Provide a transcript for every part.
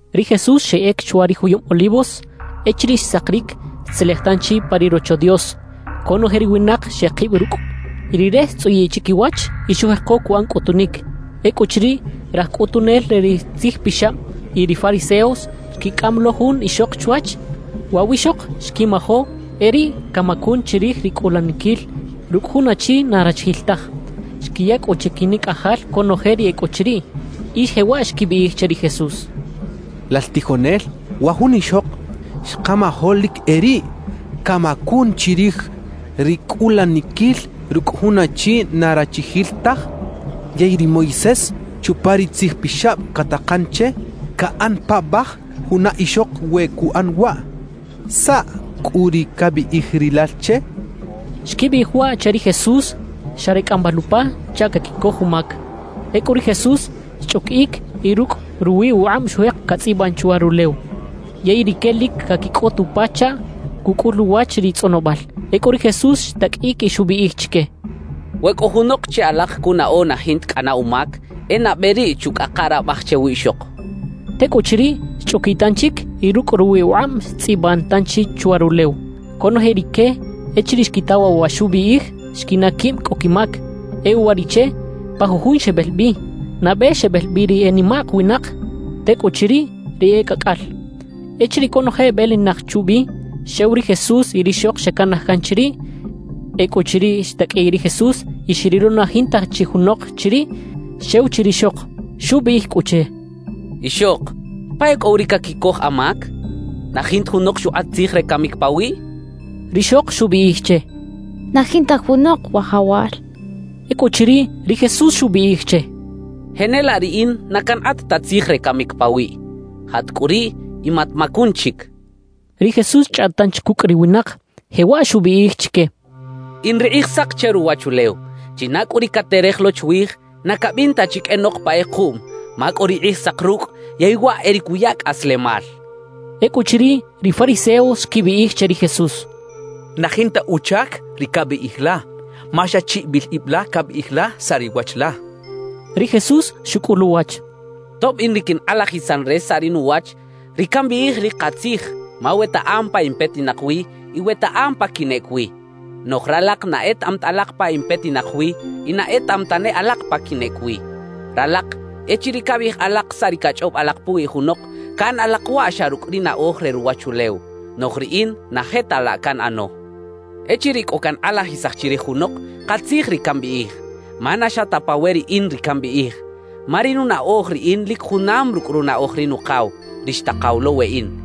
Ri Jesús xeꞌec chwa ri juyub Olivos. Echiriꞌ xsakiric, xtzelej tanchi pa ri Rocho Dios. Conoje ri winak xekib rucꞌ y Rire xtzꞌuyiꞌ chiquiwach y xujeko cuꞌan cꞌutunic. Ecꞌuchiriꞌ, raj cꞌutunel re ri tzijpixab y ri fariseos xquicꞌam lo jun ixok chwach. Waꞌ wiꞌxok xquimajo e riꞌ camacun chirij ri cꞌulaniquil rucꞌ jun achi na rachijil taj. Xquiya cꞌu chiquinicꞌajal conoje ri e cꞌo chiriꞌ y jewaꞌ xquibiꞌij che ri Jesús: —Lal tijonel, wa jun ixok xkamajo lic e riꞌ camacun chirij ri cꞌulaniquil rucꞌ jun achi na rachijil taj. Yey ri Moisés, chupa ri Tzij Pixab catakan che caꞌan paꞌbaj juna ixok we cuꞌan waꞌ. ¿Saꞌ cꞌu ri cabiꞌij rilal che? —xechaꞌ. Xquibiꞌij waꞌ che ri Jesús xa re cꞌambal upa chaꞌ caquicoj umac. Ecꞌu ri Jesús xchꞌuquiꞌic y rucꞌ ruwi ukꞌab xujek catzꞌiban chwa rulew. Yey rique lic caquicꞌot upa chaꞌ cucꞌul uwach ri tzꞌonobal. Ecꞌu ri Jesús xtaqꞌuiꞌic y xubiꞌij chique: —We cꞌo junok che alak cunaꞌo na jinta cꞌana umac, e nabe riꞌ chucꞌaka rabaj che wiꞌxok —xchaꞌ. Tecꞌuchiriꞌ, xchꞌuquiꞌ tanchic y rucꞌ ruwi ukꞌab xtzꞌiban tanchi chwa rulew. Conoje rique echiriꞌ xquita waꞌ wa xubiꞌij, xquinaꞌ quib cꞌo quimac. E uwariꞌche, pa jujun xebel bi. Nabe xebel bi ri e nimak winak; tecꞌuchiriꞌ, ri e cꞌacꞌal. Echiriꞌ conoje ebelinak chubi, xew ri Jesús y rixok xecanaj can chiriꞌ. Ecꞌuchiriꞌ xtaqꞌuiꞌ ri Jesús y xrilo na jinta chi junok chiriꞌ, xew chi rixok, xubiꞌij cꞌu che: —Ixok ¿pa e cꞌo wi ri caquicoj amac? ¿Na jinta junok xukꞌat tzij re camic pawiꞌ? —xchaꞌ. Rixok xubiꞌij che: —Na jinta junok, Wajawal —xchaꞌ. Ecꞌuchiriꞌ, ri Jesús xubiꞌij che: —Jenelaꞌ riꞌin na cankꞌat ta tzij re camic pawiꞌ. Jat cꞌu riꞌ y matmacun chic —xchaꞌ. Ri Jesús xchꞌaꞌt tanchi cucꞌ ri winak, jewaꞌ xubiꞌij chique: —In ri Kꞌijsak che ruwachulew. China cꞌu ri caterej lo chwij, na cabin ta chi qꞌuenok pa kꞌekuꞌm ma cꞌo ri Kꞌijsak rucꞌ yey waꞌ e ri cuya cꞌaslemal —xchaꞌ. Ecꞌuchiriꞌ, ri fariseos xquibiꞌij che ri Jesús: —Na jinta uchac ri cabiꞌij la, ma xa chiꞌibil ib la cabiꞌij la saꞌ ri wach la —xechaꞌ. Ri Jesús xucꞌul uwach: —Tob in ri quinkꞌalajisan re saꞌ ri nuwach, ri cambiꞌij lic katzij; ma wetaꞌam pa in petinak wi y wetaꞌam pa quinꞌec wi. Noꞌj ralak na etaꞌam ta alak pa in petinak wi y na etaꞌam tane alak pa quinꞌec wi. »Ralak, echiriꞌ cabiꞌij alak saꞌ ri cachꞌob alak puwi junok, caꞌan alak waꞌ xa rucꞌ ri naꞌoj re ruwachulew. Noꞌj riꞌin na je ta laꞌ canꞌano. Echiriꞌ cꞌo cankꞌalajisaj chirij junok, katzij ri cambiꞌij. Ma na xa ta pa we riꞌin ri cambiꞌij; ma ri nunaꞌoj riꞌin lic junam rucꞌ runaꞌoj ri Nukaw, ri xtakaw lo weꞌin.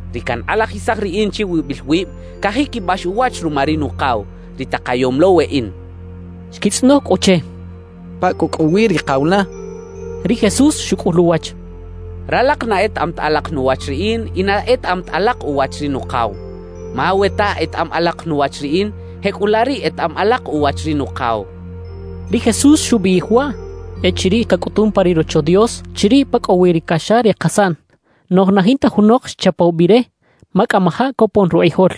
Ri cankꞌalajisaj riꞌin chiwibil wib, cajiquibax uwach ruma ri Nukaw, ri takayom lo weꞌin —xchaꞌ. Xquitzꞌonoj cꞌu che: —¿Pa cꞌu cꞌo wi ri kaw la? —xechaꞌ. Ri Jesús xucꞌul uwach: —Ralak na etaꞌam ta alak nuwach riꞌin y na etaꞌam ta alak uwach ri Nukaw; ma we ta etaꞌam alak nuwach riꞌin, jecꞌulaꞌ riꞌ etaꞌam alak uwach ri Nukaw —xchaꞌ. Ri Jesús xubiꞌij waꞌ echiriꞌ cacꞌutun pa ri Rocho Dios, chiriꞌ pa cꞌo wi ri caxa re kasaꞌn. Noꞌj na jinta junok xchapaw bi re, ma cꞌamajaꞌ copon rukꞌijol.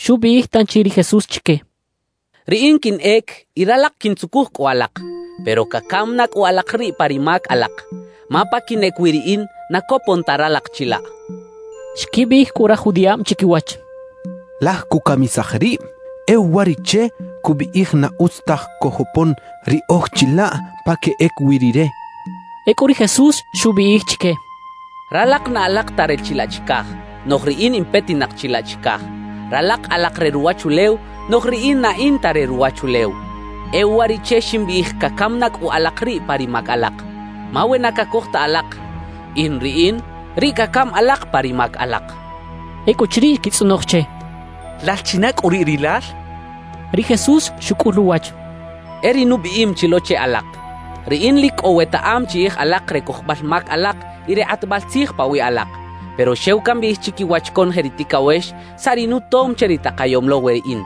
Xubiꞌij tanchi ri Jesús chique: —Riꞌin quinꞌec y ralak quintzucuj cꞌu alak, pero cacam na cꞌu alak riꞌ pa ri mac alak. Ma pa quinꞌec wi riꞌin, na copon ta ralak chilaꞌ —xchaꞌ. Xquibiꞌij cꞌu raj judiꞌab chiquiwach: «Laj cucamisaj rib; e uwariꞌche cubiꞌij na utz taj cojopon riꞌoj chilaꞌ pa queꞌec wi rire» xechaꞌ. Ecꞌu ri Jesús xubiꞌij chique: —Ralak na alak ta re chilaꞌ chicaj, noꞌj riꞌin in petinak chilaꞌ chicaj. Ralak alak re ruwachulew, noꞌj riꞌin na in ta re ruwachulew. E uwariꞌche ximbiꞌij cacam na cꞌu alak riꞌ pa ri mac alak. Ma we na cacoj ta alak “In Riꞌin”, riꞌ cacam alak pa ri mac alak —xchaꞌ. Ecꞌuchiriꞌ xquitzꞌonoj che: —¿Lal china cꞌu riꞌ rilal? —xechaꞌ. Ri Jesús xucꞌul uwach: —E ri nubiꞌim chi lo che alak. Riꞌin lic cꞌo wetaꞌam chiꞌij alak re cojobal mac alak y re kꞌatbal tzij pawiꞌ alak; pero xew cambiꞌij chiquiwach conoje ri ticawex saꞌ ri nutom che ri takayom lo weꞌin,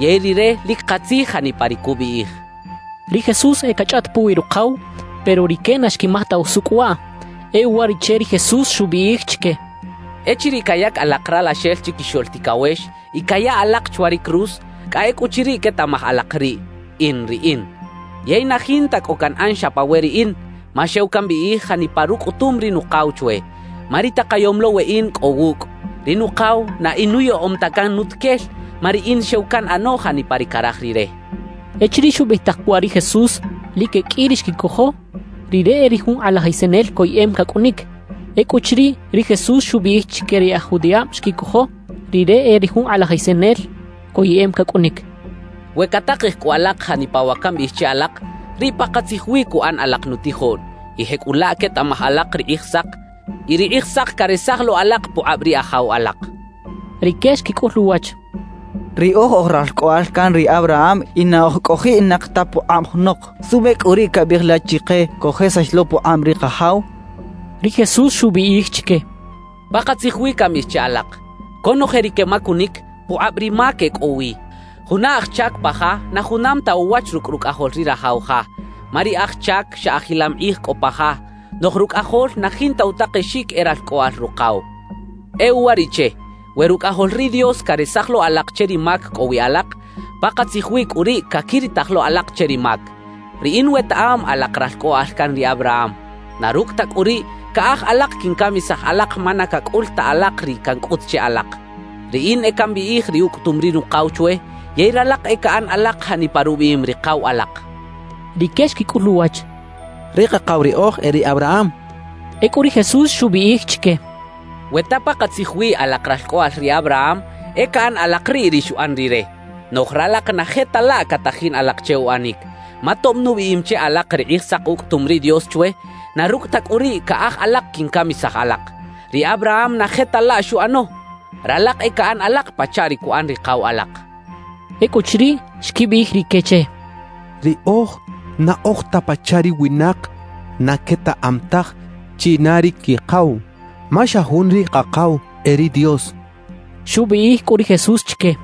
yey Rire lic katzij janipa ri cubiꞌij —xchaꞌ. Ri Jesús e cachꞌaꞌt puwi Rukaw, pero rique na xquimaj ta usucꞌ waꞌ. E uwariꞌche ri Jesús xubiꞌij chique: —Echiriꞌ cayac alak Ralaxel Chiquixoꞌl Ticawex y caya alak chwa ri cruz, cꞌa ecꞌuchiriꞌ quetaꞌmaj alak riꞌ: “In Riꞌin”. Yey na jinta cꞌo canꞌan xa pa we riꞌin, ma xew cambiꞌij janipa rucꞌutum ri Nukaw chwe. Ma ri takayom lo weꞌin cꞌo wucꞌ; ri Nukaw na inuyaꞌom ta can nutuquel, ma riꞌin xew canꞌano janipa ri caraj Rire —xchaꞌ. Echiriꞌ xubiꞌij tak waꞌ ri Jesús, lic e qꞌui ri xquicojo Rire e ri jun kꞌalajisanel coyeꞌem cacꞌunic. Ecꞌuchiriꞌ, ri Jesús xubiꞌij chique ri e aj judiꞌab xquicojo Rire e ri jun kꞌalajisanel coyeꞌem cacꞌunic. —We catakej cꞌu alak janipa wa cambiꞌij che alak, riꞌ pakatzij wi cuꞌan alak nutijoꞌn; y jecꞌulaꞌ quetaꞌmaj alak ri Kꞌijsak, y ri Kꞌijsak caresaj lo alak pukꞌab ri ajaw alak —xchaꞌ. Rique xquicꞌul uwach: —Riꞌoj oj ralcꞌoꞌal can ri Abraham y na oj cꞌojiꞌnak ta pukꞌab junok. ¿Suꞌbe cꞌu riꞌ cabiꞌij la chike cojesax lo pukꞌab ri kajaw? —xechaꞌ. Ri Jesús xubiꞌij chique: —Pakatzij wi cambiꞌij che alak: Conoje ri quemacunic, pukꞌab ri mac e cꞌo wi. Juna aj chac pa ja na junam ta uwach rucꞌ rucꞌajol ri rajaw ja, ma ri aj chac xa ajilam kꞌij cꞌo pa ja; noꞌj rucꞌajol na jinta utakexic e ralcꞌoꞌal rukaw. E uwariꞌche, we Rucꞌajol ri Dios caresaj lo alak che ri mac cꞌo wi alak, pakatzij wi cꞌu riꞌ caquiritaj lo alak che ri mac. »Riꞌin wetaꞌam alak ralcꞌoꞌal can ri Abraham; na rucꞌ ta cꞌu riꞌ, caꞌaj alak quincamisaj alak ma na cacꞌul ta alak ri cancꞌut che alak. Riꞌin e cambiꞌij ri ucꞌutum ri Nukaw chwe, yey ralak e caꞌan alak janipa rubiꞌim ri kaw alak —xchaꞌ. Rique xquicꞌul uwach: —Ri kakaw riꞌoj e ri Abraham —xechaꞌ. Ecꞌu ri Jesús xubiꞌij chique: —We ta pakatzij wi alak ralcꞌoꞌal ri Abraham, e caꞌan alak riꞌ ri xuꞌan rire. Noꞌj ralak na je ta laꞌ catajin alak che uꞌanic. Ma tob nubiꞌim che alak ri Kꞌijsak ucꞌutum ri Dios chwe, na rucꞌ ta cꞌu riꞌ, caꞌaj alak quincamisaj alak. ¡Ri Abraham na je ta laꞌ xuꞌano! Ralak e caꞌan alak pachaꞌ ri cuꞌan ri kaw alak —xchaꞌ. Ecꞌuchiriꞌ, xquibiꞌij rique che: —Riꞌoj na oj ta pachaꞌ ri winak na quetaꞌam taj china ri quikaw; ma xa jun ri Kakaw, e ri Dios —xechaꞌ. Xubiꞌij cꞌu ri Jesús chique: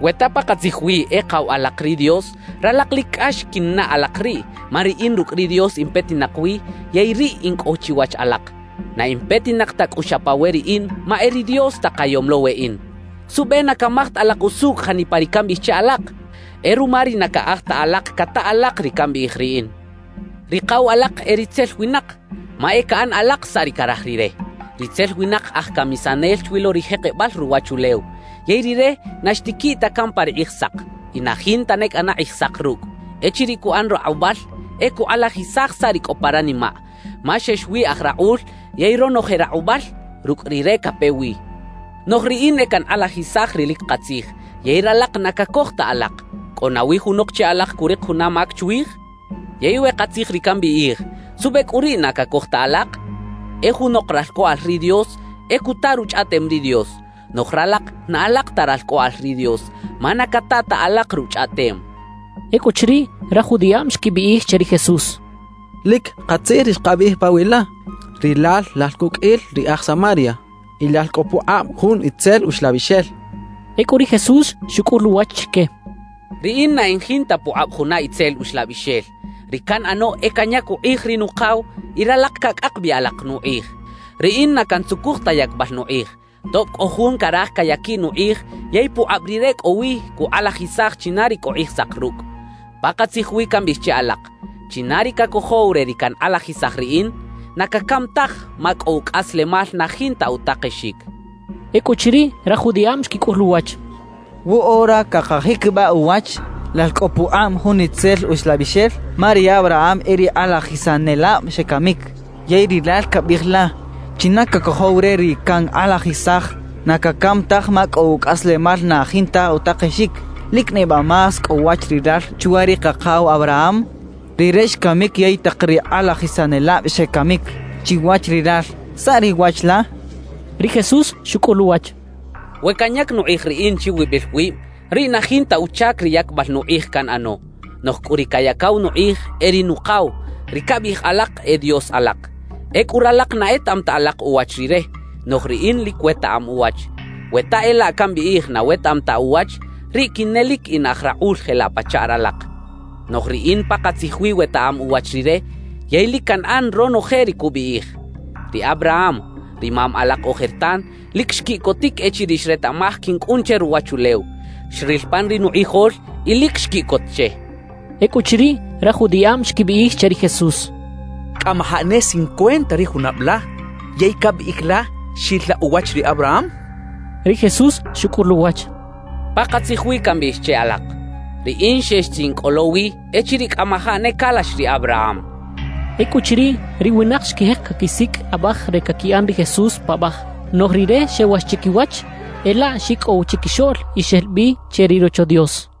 —We ta pakatzij wi e kaw alak ri Dios, ralak lic cꞌax quinnaꞌ alak riꞌ, ma riꞌin rucꞌ ri Dios in petinak wi yey riꞌ in cꞌo chiwach alak. Na in petinak ta cꞌu xa pa we riꞌin, ma e ri Dios takayom lo weꞌin. »¿Suꞌbe na camaj ta alak usucꞌ janipa ri cambiꞌij che alak? E ruma ri na caꞌaj ta alak cata alak ri cambiꞌij riꞌin. Ri kaw alak e ritzel winak, ma e caꞌan alak saꞌ ri caraj rire. Ritzel winak aj camisanel chwi lo ri jekebal ruwachulew. Yey rire na xtiquiꞌ ta can pa ri Kꞌijsak, y na jinta ne cꞌana Kꞌijsak rucꞌ. Echiriꞌ cuꞌan rakꞌubal, e cukꞌalajisaj saꞌ ri cꞌo pa ranimaꞌ; ma xex wi aj rakꞌul yey ronoje rakꞌubal rucꞌ rire cape wi. Noꞌj riꞌin e cankꞌalajisaj ri lic katzij, yey ralak na cacoj ta alak. »¿Cꞌo nawi junok che alak curik juna mac chwij? Yey we katzij ri cambiꞌij, ¿suꞌbe cꞌu riꞌ na cacoj ta alak? E junok ralcꞌoꞌal ri Dios, e cuta Ruchꞌaꞌtem ri Dios; noꞌj ralak na alak ta ralcꞌoꞌal ri Dios, ma na cata ta alak Ruchꞌaꞌtem —xchaꞌ. Ecꞌuchiriꞌ, raj judiꞌab xquibiꞌij che ri Jesús: —Lic katzij ri xkabiꞌij pawiꞌ la: Rilal lal cuqꞌuil ri aj Samaria y lal cꞌo pukꞌab jun itzel uxlabixel —xechaꞌ. Ecꞌu ri Jesús xucꞌul uwach chique: —Riꞌin na in jinta pukꞌab juna itzel uxlabixel; ri canꞌano e canyac ukꞌij ri Nukaw y ralak cacꞌak bi alak nukꞌij. Riꞌin na cantzucuj ta yacbal nukꞌij, tob cꞌo Jun caraj cayaquiꞌ nukꞌij yey pukꞌab Rire cꞌo wi cukꞌalajisaj china ri cꞌo Kꞌijsak rucꞌ. Pakatzij wi cambiꞌij che alak: China ri cacojow re ri cankꞌalajisaj riꞌin, na cacam taj ma cꞌo ucꞌaslemal na jinta utakexic —xchaꞌ. Ecꞌuchiriꞌ, raj judiꞌab xquicꞌul uwach: —Woꞌora cakajiquibaꞌ uwach, lal cꞌo pukꞌab jun itzel uxlabixel. Ma ri Abraham y ri kꞌalajisanelab xecamic, yey rilal cabiꞌij la: “China cacojow re ri cankꞌalajisaj, na cacam taj ma cꞌo ucꞌaslemal na jinta utakexic.” ¿Lic neba más cꞌo wach rilal chwa ri kakaw Abraham? Rire xcamic yey tak ri kꞌalajisanelab xecamic. Chiwach rilal, ¿saꞌ ri wach la? —xechaꞌ. Ri Jesús xucꞌul uwach: —We canyac nukꞌij riꞌin chiwibil wib, riꞌ na jinta uchac ri yacbal nukꞌij canꞌano; noꞌj cꞌu ri cayacaw nukꞌij e ri Nukaw, ri cabiꞌij alak e Dios alak. Ecꞌu ralak na etaꞌam ta alak uwach Rire; noꞌj riꞌin lic wetaꞌam uwach. We ta e laꞌ cambiꞌij na wetaꞌam ta uwach, riꞌ quinelic in aj rakꞌul jelaꞌ pachaꞌ ralak. Noꞌj riꞌin pakatzij wi wetaꞌam uwach Rire yey lic canꞌan ronoje ri cubiꞌij. Ri Abraham, ri mam alak ojertan, lic xquiꞌcotic echiriꞌ xretaꞌmaj quincꞌun che ruwachulew; xril pan ri nukꞌijol y lic xquiꞌcot che —xchaꞌ. Ecꞌuchiriꞌ, raj judiꞌab xquibiꞌij che ri Jesús: —Cꞌamajaꞌ ne cincuenta ri junab la, ¿yey cabiꞌij la xil la uwach ri Abraham? —xechaꞌ. Ri Jesús xucꞌul uwach: —Pakatzij wi cambiꞌij che alak: Riꞌin xex chi in cꞌo lo wi echiriꞌ cꞌamajaꞌ ne calax ri Abraham —xchaꞌ. Ecꞌuchiriꞌ, ri winak xquijek caquisicꞌ abaj re caquiꞌan ri Jesús paꞌbaj; noꞌj Rire xewax chiquiwach, e laꞌ xicꞌow chiquixoꞌl y xel bi che ri Rocho Dios.